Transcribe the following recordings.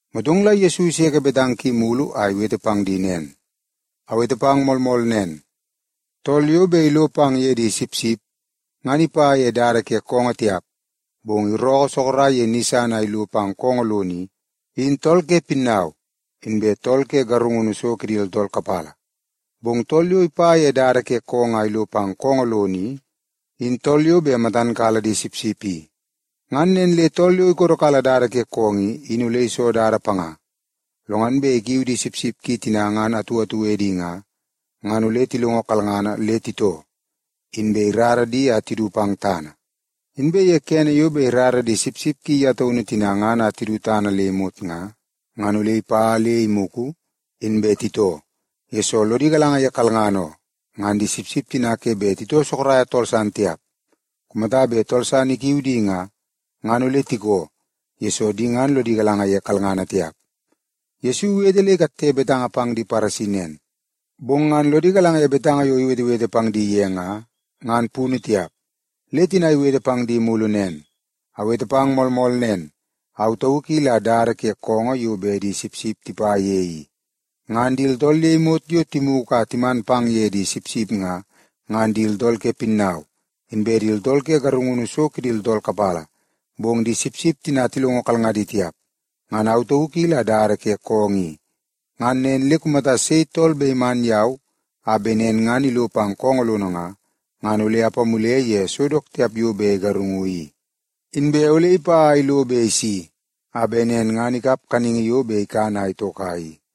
Motong la Yesu iseke betanga ki mulu a iwete pang di nen, “Awete pang moolmool nen, tool yo bet ilo pang ye di sipsip, ngan ipa ye dada ke koongoo tiap, bong irookoo sorok ye ni san a ilo pang koongoo lono i, in tool ke pinnau inbe tool ke garungunu so kidi tooltool kapala. Bong tool yo ipa ye dada ke koongoo a ilo pang koongoo lono i, in tool yo bet matan kala di sipsip i. Ngan nen le tool yo ikodokala dada ke koongoo i, in ole iso dada panga. Lo ngan bet ikiu di sipsip ki tina ngan atu atu edi nga, ngan ole tilongo kalngana le titoo, inbe irara di a tidu pang tana. Inbe ye kene yo bet irara di sipsip ki ye taunu tina ngan a tidu tana le imot nga, ngan ole ipa le imugu, inbe titoo, yesoo lodi galanga ye kalngana oo. Ngan di sipsip tina ke bet titoo soroko tool san tiap. Kumata bet tool san ikiu di nga, ngan ole tikoo, yesoo di ngan lodi galanga ye kalngana tiap.” Yesu iwete le ikatte betanga pang di Paresi nen, bong ngan lodi galanga ye betanga yo iwetewete pang di ye nga, ngan punu tiap. Le tina iwete pang di mulu nen, “Awete pang moolmool nen. Au tauk i la dada ke koongoo yo bet di sipsip tipa ye i. Ngan di tooltool le imot yo timugu a timan pang ye di sipsip nga, ngan di tooltool ke pinnau, inbe di tooltool ke garungunu so kidi tooltool kapala, bong di sipsip tina tilongo kalngadi tiap. Ngan au tauk i la dada ke koongoo i. Ngan nen le kumata sei tool bet iman yau a bet nen ngan ilo pang koongoo lono nga, ngan ole apamule ye so dook tiap yo bet igarungu i. Inbe ole ipa a ilo be isi, a bet nen ngan ikap kaningi yo bet ikan a itoka i.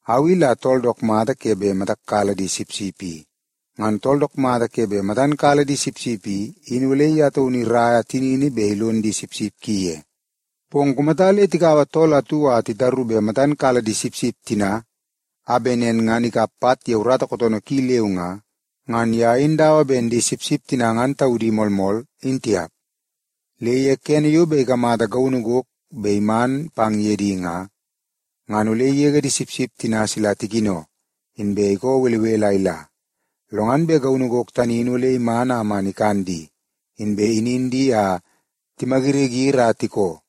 “Au i la tool dook mata ke bet matak kala di sipsip i. Ngan tool dook mata ke bet matan kala di sipsip i, in ole ye taunu iraia tinini bet ilon di sipsip ki ye. Bong kumata le tikaua tool atu a titaru bet matan kala di sipsip tina, a bet nen ngan ikap pat ye urata kootoonoo ki leu nga, ngan ye in dawa ben di sipsip tina ngan taudi moolmool, in tiap. Le ye kene yo bet ikamata gaunu gok bet iman pang ye di nga, ngan ole igege di sipsip tina sila tikino, inbe ikoo belebele a ila. Lo ngan bet gaunu gok tani in ole iman a man ikan di, inbe inin di a timayiriyiri a tikoo.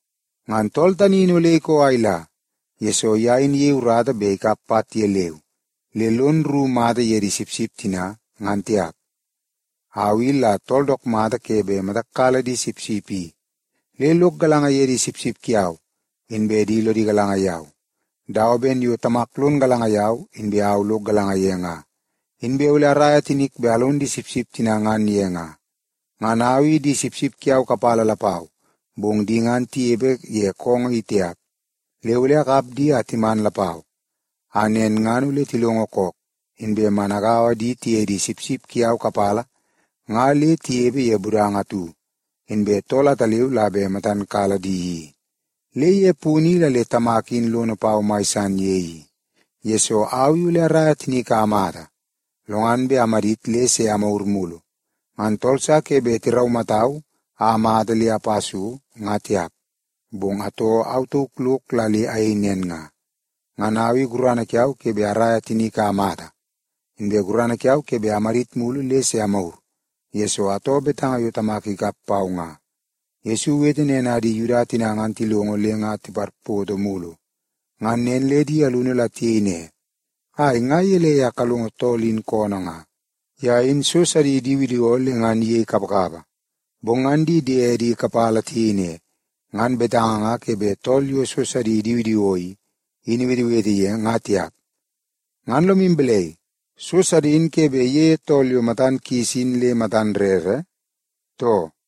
Ngan tool tani in ole ikoo a ila, yesoo ye in iyei urata bet ikap pat ye leu, le lon rru mata ye di sipsip tina, ngan tiap. “Au i la tool dook mata ke bet matak kala di sipsip i. Le lok galanga ye di sipsip kiau, inbe di lodi galanga yau, dawa ben yo Tamak lon galanga yau, inbe au lok galanga ye nga. Inbe ole araia tinik bet alon di sipsip tina ngan ye nga. Ngan au i di sipsip kiau kapala lapau, bong di ngan tinepe ye koongoo i tiap. Le ole akap di a timan lapau, a nen ngan ole tilongo kook, inbe man agaua di tiye di sipsip kiau kapala nga le tinepe ye budanga atu, inbe tool ataleu la bet matan kala di i. Le ye punu i la le Tamak in lono pau mai san ye i, yesoo au i ole araia tinik a amata, lo ngan bet amadit le se amagur mulu. Ngan tool sa ke bet iraumatau a amata le apa so, nga tiap, bong atoo au tauk lok la le ayei nen nga. Ngan au i gurana kiau ke bet araia tinik a amata, inbe gurana kiau ke bet amadit mulu le se amagur, yesoo atoo betanga yo Tamak ikap pau nga.” Yesu iwete nen a di Yuda tina ngan tilongo, le nga tiparpoto mulu. Ngan nen le di alunu la tiyei ne, “Ai, nga gelei a kalongo tool in koonoo nga? Ye in so sidi idiwidiwoo le ngan iyei kapakapa.” Bong ngan di diedi kapala tiyei ne, “Ngan betanga nga ke bet tool yo so sidi idiwidiwoo i, in iwetewete ye, ngan tiap. Ngan lomu balai, so sidi in ke bet iyeie tool yo matan kis in le matan rere, too?”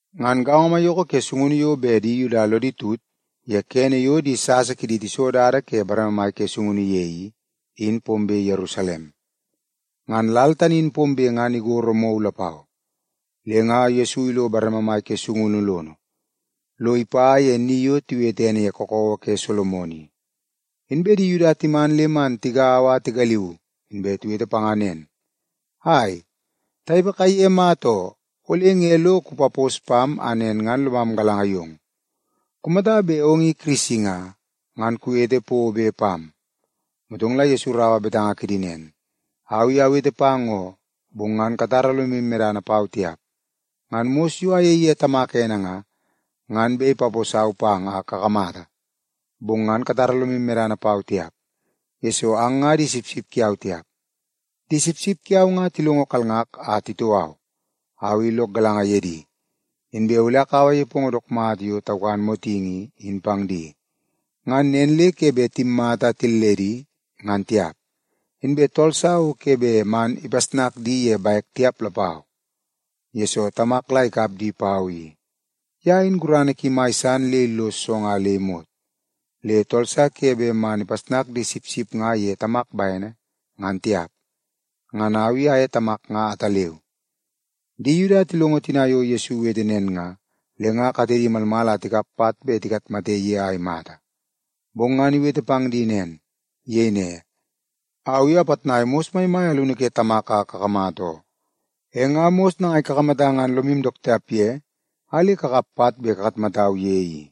Ngan gaongo maiyoko ke sungunu yo bet di Yuda lodi tut ye kene yo di sasa kidi tiso dada ke bareme ke sungunu ye i, in pombe Yerusalem. Ngan lal tani in pombe ngan igoro mou lapau. Le nga Yesu ilo bareme mai ke sungunu lono, lo ipa ye ni yo tiwete ene ye Kakawa ke Solomon i. Inbe di Yuda timan le man tigaua a tigaliu, inbe tiwete panga nen, “Ai, tanepe kaiye mata oo, ole nge lo kupapos pam a nen ngan lomam galanga yong? Kumata bet ong i Kirisi nga, ngan kuwete pobe pam.” Motong la Yesu iraua betanga kidi nen, “Au i awete pang oo, bong ngan katara lomu medana pau tiap. Ngan mos yo ayei ye Tamak ene nga, ngan bet ipaposau pang a kakamata. Bong ngan katara lomu medana pau tiap, yesoo ang nga di sipsip kiau tiap. Di sipsip kiau nga tilongo kalngak a titoo au. Au i lok galanga ye di, inbe ole akaua nepongo dook mata yo taukan motingi i, in pang di. Ngan nen le ke bet timmata a tilledi, ngan tiap. Inbe tool sa o ke bet man ipasnak di ye bek tiap lapau. Yesoo, Tamak la ikap di pau i. Ye in gurana ki mai san le illos so nga le imot, le tool sa ke bet man ipasnak di sipsip nga ye Tamak bene, ngan tiap. Ngan au i aye Tamak nga ataleu.” Di Yuda tilongo tina yo Yesu iwete nen nga, le nga katedi malmal a tikap pat bet tikatmate ye a imata, bong ngan iwete pang di nen. Iyei ne, “Au i apitnai mos maimai alunu ke Tamak a kakamata oo. E nga mos nangai kakamata ngan lomu dook tiap ye a le kakap pat bet kakatmatau ye i?”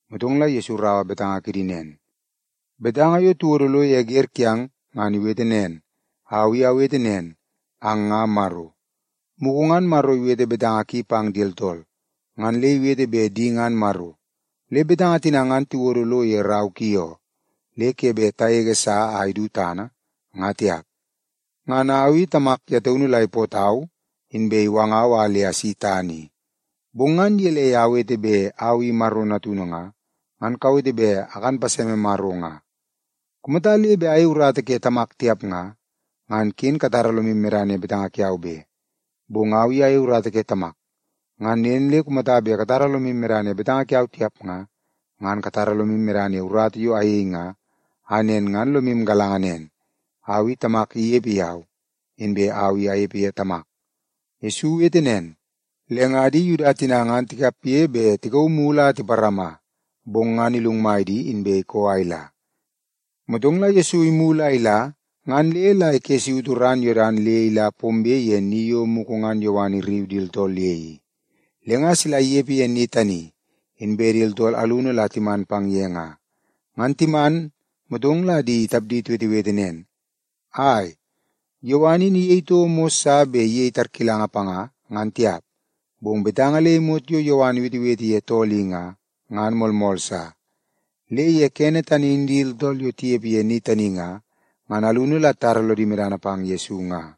Motong la Yesu iraua betanga kidi nen, “Betanga yo tiwodo lo ye wer kiang, ngan iwete nen, ‘Au i awete nen, ang nga maro.’ Mugu ngan Maro iwete betanga ki pang di tooltool, ngan le iwete bet di ngan maro. Le betanga tina ngan tiwodo lo ye rau ki oo, le ke bet tagege sa a idu tana, nga tiap. Ngan au i, Tamak ye taunu la ipootau, inbe iwangau a le asi tana i. Bong ngan gelei a awete bet Au i Maro Natunu nga, ngan kawete bet akan paseme Maro nga? Kumata le bet ayei urata ke Tamak tiap nga, ngan ken katara lomu medana ye betanga kiau be. Bong au i ayei urata ke Tamak. Ngan nen le kumata bet katara lomu medana ye betanga kiau tiap nga, ngan katara lomu medana ye urata yo ayei nga, a nen ngan lomu galanga nen, au i Tamak inepe yau, inbe au i anepe ye Tamak.” Yesu iwete nen, le nga di Yuda tina ngan tikapge bet tikauu mulu a tiparama, bong ngan ilungmai di, inbe ikoo a ila. Motong la Yesu imulu a ila ngan le la ikessautu ran Yodan le ila pombe ye ni yo mugu ngan Yowan irriu di tooltool ye i. Le nga sila inepe ye ni tani, inbe di tooltool alunu la timan pang ye nga. Ngan timan, motong la di tapdi tiwetewete nen, “Ai, Yowan in iyei toko mos sa bet iyei tarkilanga panga, ngan tiap, bong betanga le imot yo Yowan iwetewete ye tool i nga, ngan moolmool sa.” Le ye kene tani in di tooltool yo tinepe ye ni tani nga, ngan alunu la titara lodi medana pang Yesu nga.